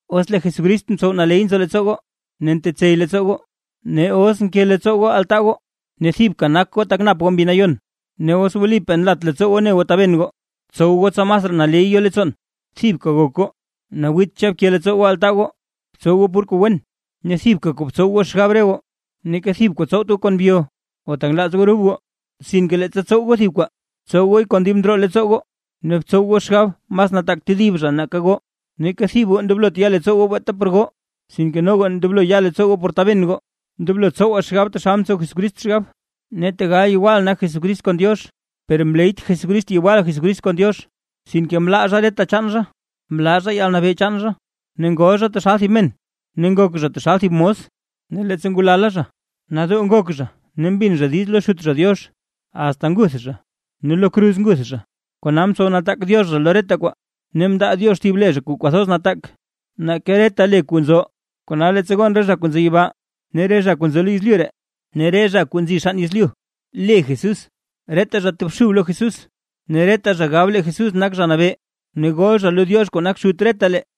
Os lee Jesucrist ntsow naley nzo leettsoo goo ne ntetsey leettsoo goo, ne os nke leettsoo goo altaa goo, ne thibka nak goo tak nap goo Mbi Nayon, ne os wlipaa nlat leettsoo goo ne goo taben goo, btsow goo tsa masraa naley yo leettsoon, thibka gok goo, nawiitxa bke leettsoo goo altaa goo, btsow goo pur kuu wen ne thibka kuu btsow goo xgab. Neeka thib kuu tsowt goo kon byo o tak nlaaz goo rub goo, sinke leettsa tsow goo thib kwaa, btsow gooy kon dib ndroo leettsoo goo ne btsow goo xgab mas nataak tedib zha nake goo. Neeka thib goo ndoblot ya leettsoo goo beeta por goo, sinke noga ndoblo ya leettsoo goo por taben goo. Ndoblo tsowaa xgab taxal mtsow Jesucrist xgab. Ne tegal yewal nak Jesucrist kon Diox, per mleyt Jesucrist yewal Jesucrist kon Diox. Sinke mlaa zha reta chaan zha, mlaa zha yalnabee chaan zha, ne ngol zha taxal thib men ne ngok zha taxal thib mos. Ne leettsa ngulala zha, nadoo ngok zha ne mbin zha diiz lo Xut zha Diox, asta nguth zha, ne lo kruz nguth zha. Kona mtsow nataak Diox zha lo reta kwaa. Ne mndaa Diox thib le zha kuu kwathoz nataak nake reta le kuu nzo. Kona leettsa gon, re zha kuu nzo yibaa ne re zha kuu nzo lo yezlyu ree, ne re zha kuu nzi xann yezlyu le Jesús, reta zha tobxub lo Jesús. Ne reta zha gab lee Jesucrist nak Zha Nabee, ne gol zha lo Diox kuu nak Xut retalee.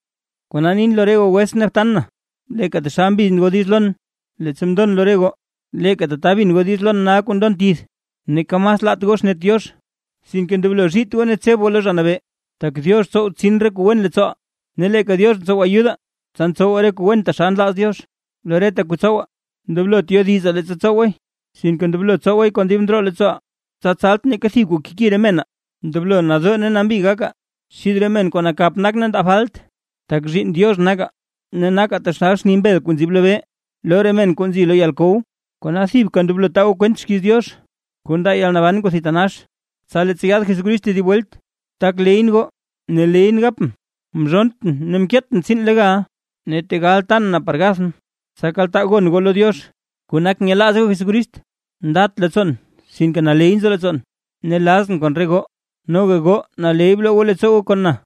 Kona nin lo re goo wetsʼn ne btan na, leeka taxal mbin goo diiz lon leettsa mndon lo re goo, leeka tata bin goo diiz lon nal kuu ndon tith. Neeka mas laat goo xnet Diox, sinke ndoblo zhiit goo ne tseb goo lo Zha Nabee. Tak Diox ntsow ntsin re kuu wen leettsooʼaa ne leeka Diox ntsow ayudaa, tsa ntsowaa re kuu wen taxal nlaaz Diox. Lo reta kuu tsowaa ndoblot yodizaa leettsa tsowaay, sinke ndoblo tsowaay kon dib ndroo leettsooʼaa, tsa tsalt neeka thib kuu keki re menaa. Ndoblo nadoo ne nambi gakaa xid re men kuu nakap nak ne ndaa falt, tak zhiinn Diox nakaa ne nakaa taxal xni mbel kuu nzib lobee lo re men kuu nzi lo yalkow. Kona thibka ndoblo taa goo kwent xkiiz Diox kuu ndaa yalnaban kuu thitanax, tsa leettsa yaad Jesucrist tedib welt, tak leyʼn goo ne leyʼn gapʼn, mzhonntʼn ne mkeetʼn tsiin legal. Ne tegal tan na par gathʼn, tsa tak kaltaa goo gon goo lo Diox kuu nak nyelaaz goo Jesucrist, ndat leettsoon sinke naley nzo leettsoon ne lazʼn kon re goo. Noga goo naley bloo goo leettsoo goo kon na.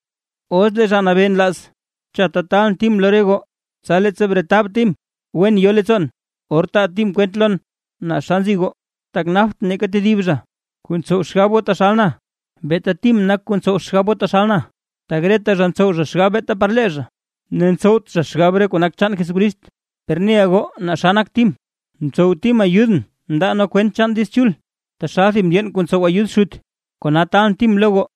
Os lee Zha Nabee nlaaz, chatta taalʼn Tim lo re goo, tsa leettsa bretab Tim, wen yo leettsoon, or taa Tim kwent lon naa xa nzi goo. Tak naptʼn neeka tedib zha kuu ntsow xgab goo taxal na, beeta Tim nak kuu ntsow xgab goo taxal na. Tak reta zha ntsow zha xgab beeta par lee zha, ne ntsowt zha xgab kuu nak chaan Jesucrist. Per neʼa goo naa xa nak Tim, mtsow Tim ayudʼn mndaa nee kwent chaan Diiz Chul, taxal thib mndyeen kuu ntsow ayud xut. Kona taalʼn Tim lo goo,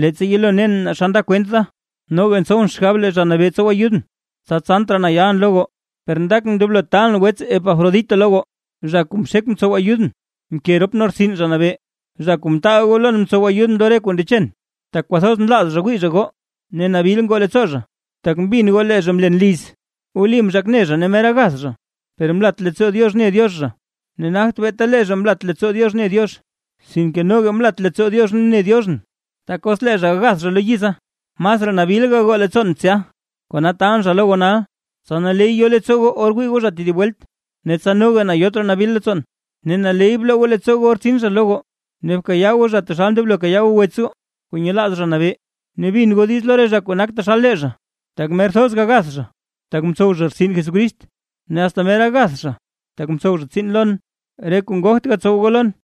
leettsa yelo nen naa xa nda kwent da. Noga ntsowʼn xgab lee Zha Nabee tsow ayudʼn, tsa tsant raa na yalʼn lo goo. Per ndakʼn ndoblo taalʼn wets Epafrodito lo goo, zha kuu mxek mtsow ayudʼn mke rop nee rtsin Zha Nabee, zha kuu mtaal goo lon mtsow ayudʼn lo re kuu ndechen, tak kwathoz nlaaz zha wii zha goo, ne nabil ngoo leettsoo zha, tak mbin goo lee zha mlen liz. Wli mzhak ne zha ne mer gagath zha; per mlat leettsoo Diox mne Diox zha, ne nagt beeta lee zha mlat leettsoo Diox mne Diox, sinke noga mlat leettsoo Diox mne Dioxʼn, tak os lee zha agath zha lo yiza, masraa nabil gagoo leettsoon tsya. Kona taalʼn zha lo goo nal, tsa naley yo leettsoo goo or wii goo zha tedib welt, ne tsa noga na yot raa nabil leettsoon. Ne naley bloo goo leettsoo goo or tsin zha lo goo, ne bkayaa goo zha taxal ndoblo kayaa goo wets goo kuu nyelaaz Zha Nabee, ne bin goo diiz lo re zha kuu nak taxal lee zha, tak mer thoz gagath zha tak mtsow zha rtsin Jesucrist. Ne asta mer gagath zha tak mtsow zha tsiin lon, re kuu ngogt goo gatsow goo lon.